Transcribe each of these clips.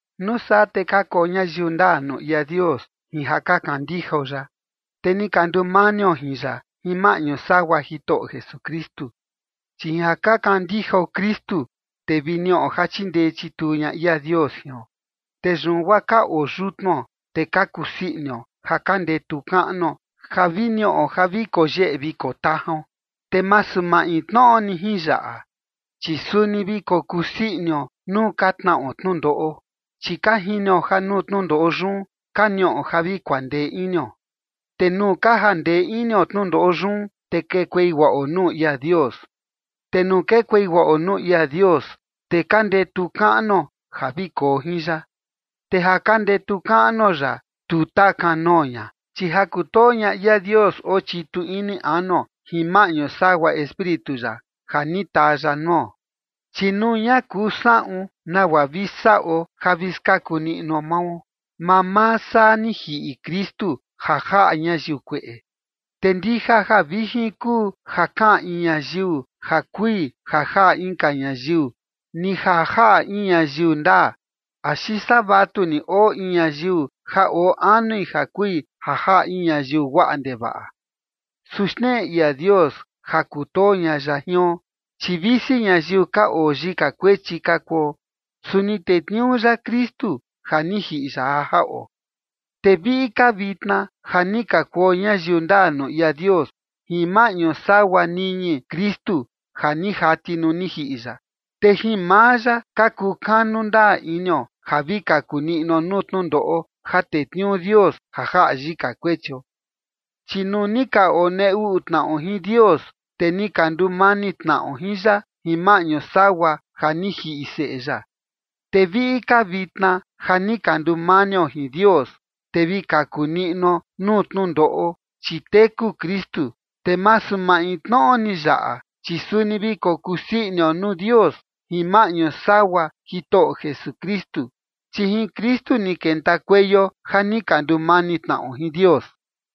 Nuu saa te ka kuo ñayiu ndaa nuu ia Dios jin ja ka kandijao ya, te ni ka ndumanio jin ya jin maꞌñu sagua Jitoꞌo Jesukristu. Chi jin ja ka kandijao Kristu, te vi niꞌo ja chindee chituu ña ia Dios jion. Te yun guaa ka oo yutnuo, te ka kusii inio, ja ka ndetu kaꞌnuo ja vi niꞌo ja vi koo yeꞌe vi koo tajaon. Te masu maintnoꞌo ni jin yaꞌa, chi suni vi kokuu sii inio nuu ka tnaꞌo tnundoꞌo, chi ka jinio ja nuu tnundoꞌo yun ka niꞌo ja vi kuandee inio. Te nuu ka jandee inio tnundoꞌo yun, te kekuei guaꞌo nuu ia Dios. Te nuu kekuei guaꞌo nuu ia Dios, te ka ndetu kaꞌnuo ja vi koo jin ya. Te ja ka ndetu kaꞌnuo ya, tu taa kanoo ña, chi ja kutoo ña ia Dios oo chitu ini anuo jin maꞌñu sagua Espíritu ya, ja ni taa ya nuo. Chi nuu ña kuu saꞌun nagua vi saꞌo ja vi skaku niꞌnuo mao, mamaa saa ni jiꞌi Kristu ja jaꞌa ñayiu kueꞌe. Te ndija ja vijin kuu ja kaꞌan in ñayiu ja kui ja jaꞌa inka ñayiu, ni ja jaꞌa in ñayiu ndaa, axi saa vatuni oo in ñayiu ja oo anui ja kui ja jaꞌa in ñayiu guaꞌa ndevaꞌa. Su xneꞌe ia Dios ja kutoo ña ya jion, chi visi ñayiu ka oo yika kuechi ka kuo, su ni tetniuu ya Kristu ja ni jiꞌi ya ja jaꞌo. Te viꞌi ka vitna ja ni ka kuo ñayiu ndaa nuu ia Dios jin maꞌñu sagua niñi Kristu ja ni jati nuu ni jiꞌi ya, te jin maa ya ka kukanu ndaa inio ja vi kaku niꞌnuo nuu tnundoꞌo ja tetniuu Dios ja jaꞌa yika kuechio. Chi nuu ni ka onee uꞌu tnaꞌo jin Dios, te ni ka ndumani tnaꞌo jin ya jin maꞌñu sagua ja ni jiꞌi Seꞌe ya, te viꞌi ka vitna ja ni ka ndumanio jin Dios, te vi kaku niꞌnuo nuu tnundoꞌo, chi teku Kristu. Te masu maintnoꞌo ni yaꞌa, chi suni vi kokuu sii inio nuu Dios jin maꞌñu sagua Jitoꞌo Jesukristu, chi jin Kristu ni kentakueio ja ni ka ndumani tnaꞌo jin Dios.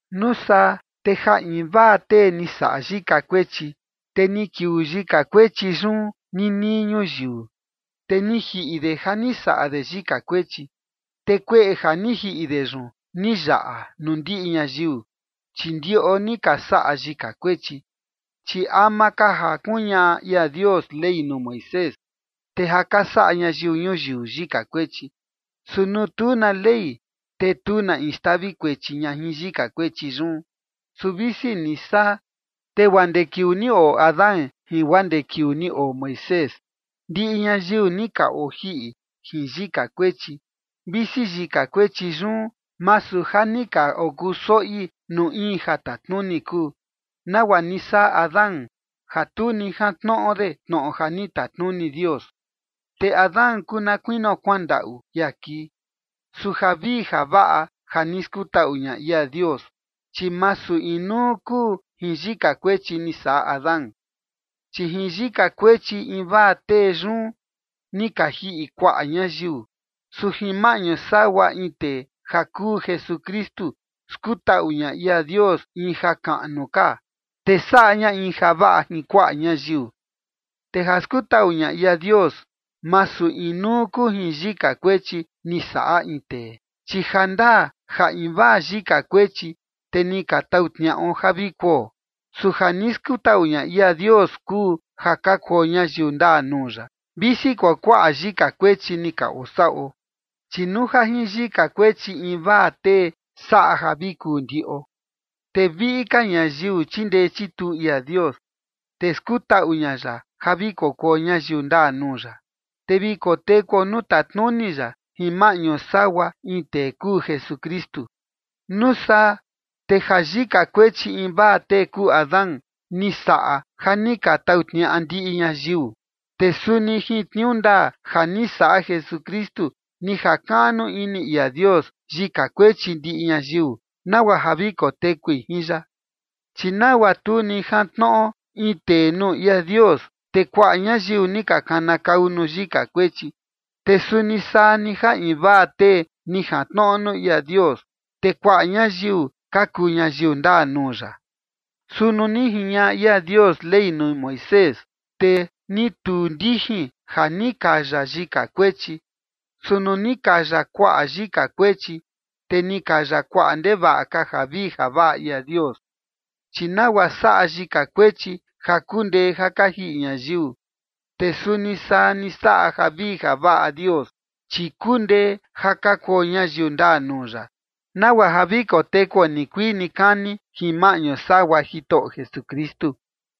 Nuu saa te ja invaa tee ni saꞌa yika kuechi, te ni kiuu yika kuechi yun nii nii ñuyiu. Te ni jiꞌi de ja ni saꞌa de yika kuechi, te kueꞌe ja ni jiꞌi de yun ni yaꞌa nuu ndiꞌi ñayiu, chi ndiꞌo ni ka saꞌa yika kuechi. Chi ama ka ja kuñaꞌa ia Dios Ley nuu Moisés, te ja ka saꞌa ñayiu ñuyiu yika kuechi. Su nuu tu na ley, te tu na in xtavi kuechi ña jin yika kuechi yun. Su visi ni saa, te guaa ndee kiuu ni oo Adán jin guaa ndee kiuu ni oo Moisés, ndiꞌi ñayiu ni ka ojiꞌi jin yika kuechi, visi yika kuechi yun, masu ja ni ka okuu soꞌi nuu in ja tatnuni kuu, nagua ni saꞌa Adán ja tu ni jantnoꞌo de tnoꞌo ja ni tatnuni Dios. Te Adán kuu na kuinio kuandaꞌu ia kii. Su javii javaꞌa ja ni skutaꞌu ña ia Dios, chi masu inuu kuu jin yika kuechi ni saꞌa Adán. Chi jin yika kuechi invaa tee yun, ni ka jiꞌi kuaꞌa ñayiu. Su jin maꞌñu sagua in tee ja kuu Jesukristu skutaꞌu ña ia Dios in jakaꞌnu ka, te saꞌa ña in javaꞌa jin kuaꞌa ñayiu. Te ja skutaꞌu ña ia Dios, masu inuu kuu jin yika kuechi ni saꞌa in tee, chi jandaa ja invaa yika kuechi, te ni ka tau tniaꞌo ja vi kuo. Su ja ni skutaꞌu ña ia Dios kuu ja ka kuo ñayiu ndaa nuu ya, visi kuakuaꞌa yika kuechi ni ka osaꞌo. Chi nuu ja jin yika kuechi invaa tee saꞌa ja vi kuu ndiꞌo, te viꞌi ka ñayiu chindee chituu ia Dios, te skutaꞌu ña ya ja vi kokuo ñayiu ndaa nuu ya, te vi kotekuo nuu tatnuni ya jin maꞌñu sagua in tee kuu Jesukristu. Nuu saa te ja yika kuechi invaa tee kuu Adán, ni saꞌa ja ni ka tau tniaꞌa ndiꞌi ñayiu, te suni jin tniuu ndaa ja ni saꞌa Jesukristu ni jakaꞌnu ini ia Dios yika kuechi ndiꞌi ñayiu, nagua ja vi kotekui jin ya. Chi nagua tu ni jantnoꞌo in tee nuu ia Dios, te kuaꞌa ñayiu ni ka kanakau nuu yika kuechi, te suni saa ni ja invaa tee ni jantnoꞌo nuu ia Dios, te kuaꞌa ñayiu ka kuu ñayiu ndaa nuu ya. Su nuu ni jiñaꞌa ia Dios Ley nuu Moisés, te ni tuu ndijin ja ni kaya yika kuechi, su nuu ni kaya kuaꞌa yika kuechi, te ni kaya kuaꞌa ndevaꞌa ka javii javaꞌa ia Dios. Chi nagua saꞌa yika kuechi ja kundee ja ka jiꞌi ñayiu, te suni saa ni saꞌa javii javaꞌa Dios, chi kundee ja ka kuo ñayiu ndaa nuu ya, nagua ja vi kotekuo nikuii nikani jin maꞌñu sagua Jitoꞌo Jesukristu.